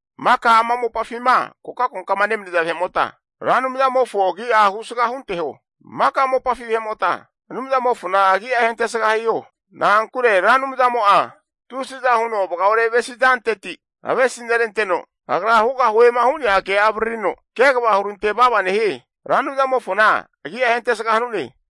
Maka ama mopafima kokankokama nemaniza vahe'mota, Ra Anumzamofo agi'a husga hunteho. Maka mopafi vahe'mota Anumzamofona agi'a ahentesga hiho. Na'ankure Ra Anumzamo'a tusiza huno vagaore avesi zanteti avesi neranteno, Agra hugahuema hu'nea ke'a avaririno kegava hurantevava nehie. Ra Anumzamofona agi'a ahentesga hanune.